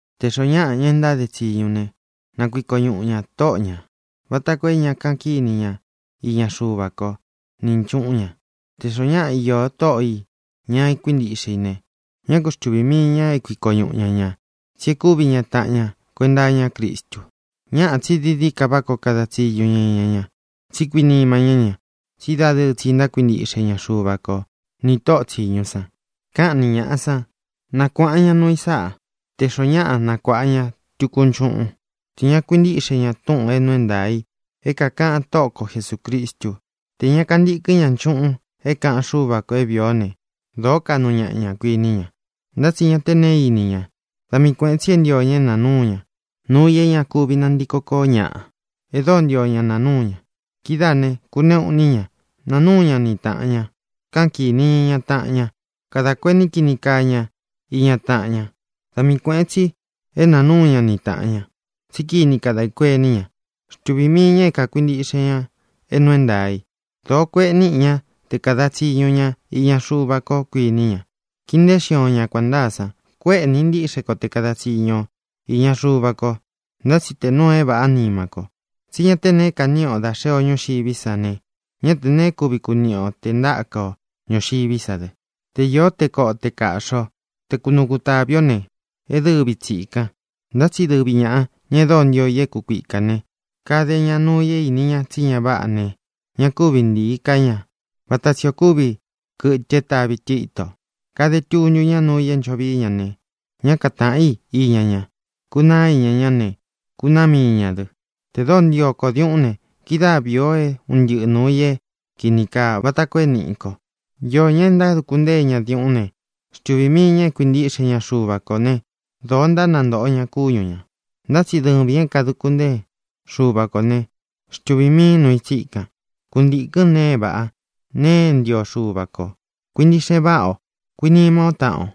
Tē xoó ñaꞌa ña e ntáde tsiñu ne, na kuiko ñuꞌu ñā tóꞌo ñā, vata koo é ña kaꞌan kíni ñaꞌa iña Xuva ko ni nchuꞌún ña. Tē xoó ñaꞌa iō tóꞌo ī ña kuíntiꞌxe i ne, ñá ku xtuvī mii ña é kuiko ñuꞌu ña ñā tsí e kúvi ña taꞌan ña kuenta iñá Cristu. Ñáꞌā, tsi dií dií ka váꞌa koo na kāda tsiñu ña iña ña, tsí kuinima ñá ña, tsí dadɨɨ tsi ntákuintiꞌxe ña Xuva ko nī tóꞌō tsiñu san. Káꞌan ni ñāꞌa sán, nakuāꞌan ña nuu i sáꞌa. Tē xoó ñaꞌa nakuāꞌa ña tuku nchuꞌún, tē ña kákuintiꞌxe ñā túꞌūn é nuu é ntaā i é kākaꞌan Tóꞌo ko Jesūcristú, tē ña kantíkɨn ña nchuꞌun é kāꞌan Xúva kō é vīi ó ne, dōó kaꞌnu ñaꞌa ña, kuiní ña, ntá tsi ña te neé ini ña. Da mii kuēꞌen tsi é ntio ña é nāa núu ña nuu i é ña kuvi nantíko koó ñaꞌa, e dóo ntio ña naa núu ña. Kidáā ne, kuneꞌu iní ña. Nāa núu ña ni tāꞌan ña. Káꞌan kīni ña iña taꞌan ña. Kadā kuení kini kaa ña iña taꞌan ña. Da mii kuēꞌen tsi é nāa núu ña ni tāꞌan ña, tsí kini kadē kuení ña. Xtuvī mii ña é kākuintiꞌxe ña é nuu é ntaā i. Dōó kueꞌe níꞌi ña te kāda tsiñu ña iña Xuva ko, kuiní ña. Kiin nteén xion ña kuān ntáa san. Kuéꞌe nīꞌi ntiꞌxe kó te kada tsiñu o īña Xuva ko, ntá tsi tē nuu e váꞌa nima ko. Tsí ña te neé kaniꞌi ō dá xee o ñúxiví sa ne, ñá tē neé kuvi kuniꞌi o tē ntáka o ñūxiví sa dɨ. Te īó te koꞌo, te kāꞌxi ó, te kunuu kutāvi ó ne, é dɨvi tsīkan. Ntá tsi dɨvi ñāꞌa, ña e dóo ntio i é kūkuika ne, kade ña nuu i é īni ña tsí ña váꞌa ne, ña kúvi ntiī ká ña, vata tsī ó kuvi kɨtɨ é tāvi tɨ ítō. Kade tuntu ñá nuu i é ncho vií ña ne, ñá katāꞌan í iña ña. Kunaá iña ña ne, kunaá mii ñā dɨ. Tē dóo ntio ko diuꞌún ne, kidáa vīi o é un ntɨꞌɨ nūu i é kīni kaa vata koo é nīꞌi ko. Īó ñaꞌa é ntántuku ñā diuꞌún ne, xtuvī mii ña é kuintiꞌxe ña Xuva kō né, dōo ntánantōꞌo ña kúñu ñā. Ntá tsi dɨvīn é kādukun ntéen Xuva kō né, xtuvīn miin núu i tsíkan; kuntīkɨ́n nēe e váꞌa, nēe e ntío Xuva kō. Kuintiꞌxe váꞌa o. Kuinima ó taꞌan o.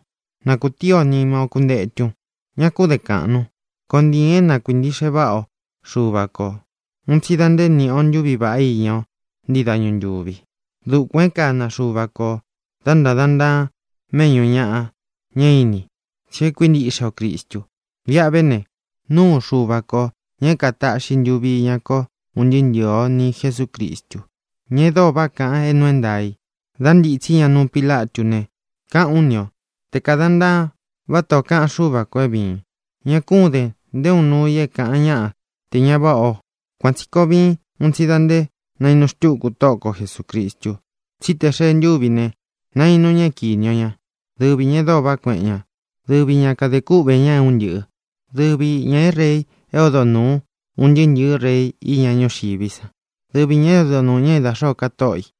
Na kūtíi o nima ó kuntetun. Ña kún den kāꞌnun. Koon ntiīn é na kuīntiꞌxe váꞌa o Xuva ko ūun tsi da nté nīꞌi o ntuví vaꞌá iña o ntii dañu ntúvi. Dukuān e kána Xuva ko ō dá ntādan ntaan méꞌñū ñaꞌa, ña é ini, tsí e kuíntiꞌxe o Cristu. Viꞌa ve ne, nuu Xúva ko, ñā é kātáꞌxi ntuvi iña ko un ntɨɨ́ ntɨ̄ɨ ó, ni Jesūcristu, ña e dóo váꞌa kaꞌan é nuu é ntaā í da ntitsí ña nuu Pílatú ne, káꞌān ú ni o te kādan ntaan vátā ó kaꞌan Xúva kō é vīin. Ña kún den nté uun nuū i é kāꞌan ñáꞌa tē ña váꞌa o. Kuan tsī koo viin un tsi da nte naínu xtuku Tóꞌo ko Jesūcristu. Tsí tē xee ntúvi i ne, nainu ña é kīni o ña. Dɨvi ñā e dóo vaꞌá kueꞌen ña. Dɨvi ña kadē kúꞌvē ña é un ntɨꞌɨ̄. Dɨvi ñā é rei é odo nūu un ntɨɨ́ ntɨ̄ɨ́ rei iña ñúxiví san. Dɨvi ñā é odo nūu ña é da xōó ka tóꞌo ī.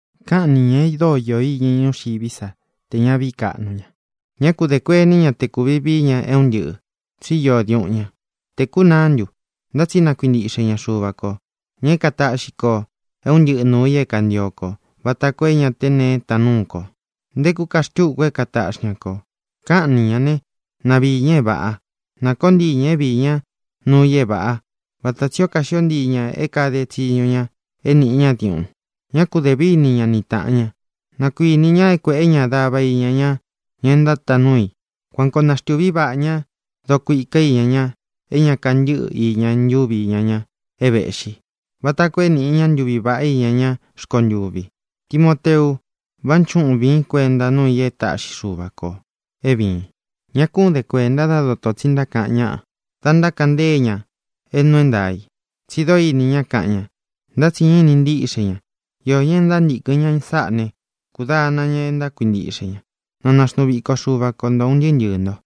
Káꞌan ni ñā e dóo iō iña i ñúxiví sa tē ña vií kaꞌnu ña. Ñá ku dē kuení ña te kūvi vií ña é un ntɨꞌɨ̄ tsí iō diuꞌun ña. ¿Te kūnaá ntu? Ntá tsi na kuintiꞌxe ña Xuva kō, ña é kataꞌxi kō é un ntɨꞌɨ nūu i é kantio kō vata koo é ña te neé taan núu ko. Ntekú ka xtuku é katāꞌxi ña ko. Káꞌan ni ñā né, na viī ña é vāꞌa. Na kōó ntii ña é viī ñá nuu i é vāꞌá vata tsī ó kaxió ntii ñā é kāde tsiñu ña é nīꞌi ñá diuꞌun. Ñá ku dē víni ña ni tāꞌan ña; na kuinī ña é kuēꞌé ña dava iña ña ña e ntátaan núu i. Kuan koo naxtūví vaꞌā ña dokuika íña ña é ña kantɨ́ꞌɨ iña ntuvi íña ña é vēꞌxí, vata koo é nīꞌi ña ntúvi vāꞌá iña ñá rkontuvi. Timoteu, vánchuꞌun vīín kuenta nuu i e táꞌxi Xuva kō é vīin. Ña kún den kuēnta dá doto tsi ntákaꞌan ñáꞌa da ntákaꞌan ntée ña é nuu é ntaā i, tsi dóo ini ña, kaꞌan ña; ntá tsi ñá ini ntíꞌxe ña. Iō ñá e ntántīkɨn ña sáꞌā né, kūdana ña é ntákuintiꞌxe ña. Na naxnuu viko Xuva ko nto ūn ntɨɨ́ ntɨɨ̄ nto.